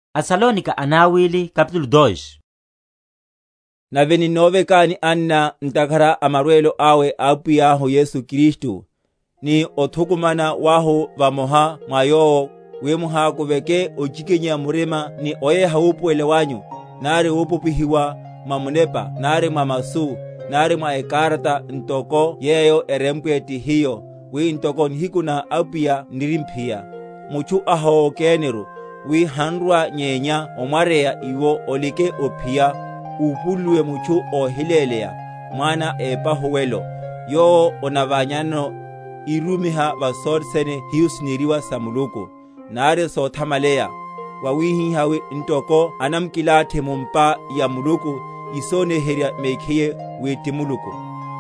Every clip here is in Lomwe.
Ahákuvale orwa Kristu enarwa‐yoneya ómukhocha Kristu. Nave, ninnovekani anna, ntakhara a marwelo awe a Apwiyahu Yesu Kristu, ni othukumana wahu vamoha mwa Yowo; wi muhákuveke ochikinyeya murima ni oyeha wupuwelela wanyu, nari wopopihiwa, mwa munepa nari mwa masu; nari mwa ekarata, ntoko yeyo erempwe ti hiyo, wi ntoko nihiku na Apwiya n’rimphiya, Mutchu ahowokeniru, wi hanrwa, nyenya omwaryeya iwo olike ophiya, úpululuwe mutchu óhiléleya, mwana épahuwelo, yowo onaványa?-?nano, írumiha va sothe sene hiho sineriwa sa Muluku, nari sothamaleya; wawihihá wi ntoko anamkilathi mu’mpa ya Muluku, isoniherya mekhiye wi ti Muluku.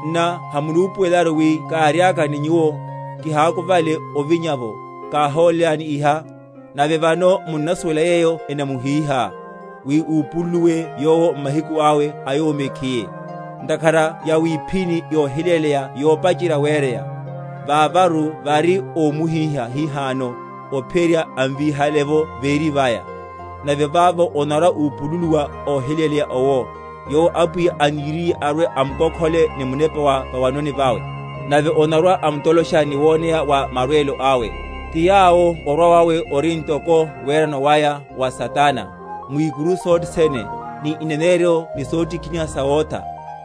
Nna hamunupuwelaru, wi káriaka ni nyuwo, kihákuvale ovinya’vo, káholélani iha? Nave vano munnasuwela yeyo enamuhíha, wi úpululuwe yowo m’mahiku awe a yowo mekhiye. Ntakhara yawiphíni yohiléleya yopacheryerya wereya; vavaru vari ómuhíha hihano, ophiyerya amvíhale’vo véri vaya. Nave vavo onarwa‐upululiwa óhiléleya owo, yowo Apwiya aniriye arwe‐amkokhole ni munepa wa va’wanoni vawe, nave onarwa‐amtolosha ni woneya wa marwelo awe; ti yawo orwa wawe ori ntoko werano waya wa Satana, mwikuru sothe sene, ni ineneryo ni sotikiniha sawotha;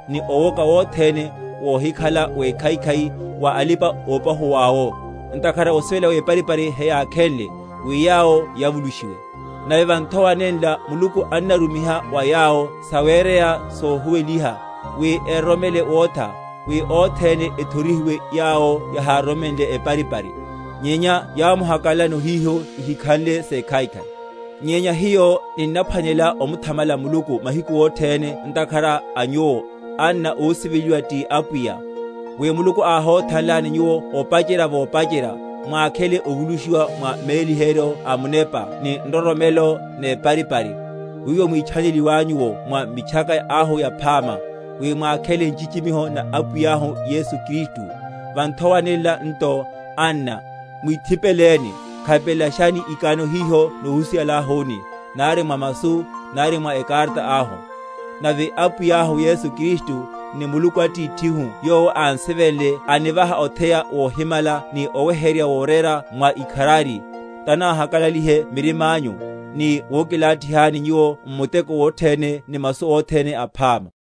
ni owoka wothene wohikhala wekhaikhai wa alipa‐opahuwáwo, ntakhara osivela weparipari heyákhenle, wi yawo yavulushiwe. Nave va nthowa nenla Muluku annarumiha wa yawo sawereya sohuweliha, wi eroromele wotha; wi othene ethorihiwe yawo yahároromenle eparipari, nyenya yámuhakalalano hiho ihikhanle sekhaikhai. Nyenya hiyo ninnaphwanelela omuthamala Muluku mahiku othene ntakhara a nyuwo, anna ósiveliwa ti Apwiya, wi Muluku áhothanlani nyuwo opacherya vopacherya, mwakhele ovulushiwa mwa méliheryo a Munepa ni nroromelo neparipari; wiwo mwítchaneliwanyu’wo mwa Mitchaka ahu Yaphama, wi mwakhele nchichimiho na Apwiyahu Yesu Kristu. Va nthowa nenla nto, anna, mwithipeleni, khapelelashani ikano hiho nohusihalahuni, nari mwa masu, nari mwa ekarata ahu. Nave Apwiyahu Yesu Kristu, ni Muluku Atithihu yowo ánsivenle anivaha otheya wohimala ni oweheryerya worera mwa ikharari, tanáhakalalihe mirimányu, ni wokilathihani nyuwo m’muteko wothene ni masu othene aphama.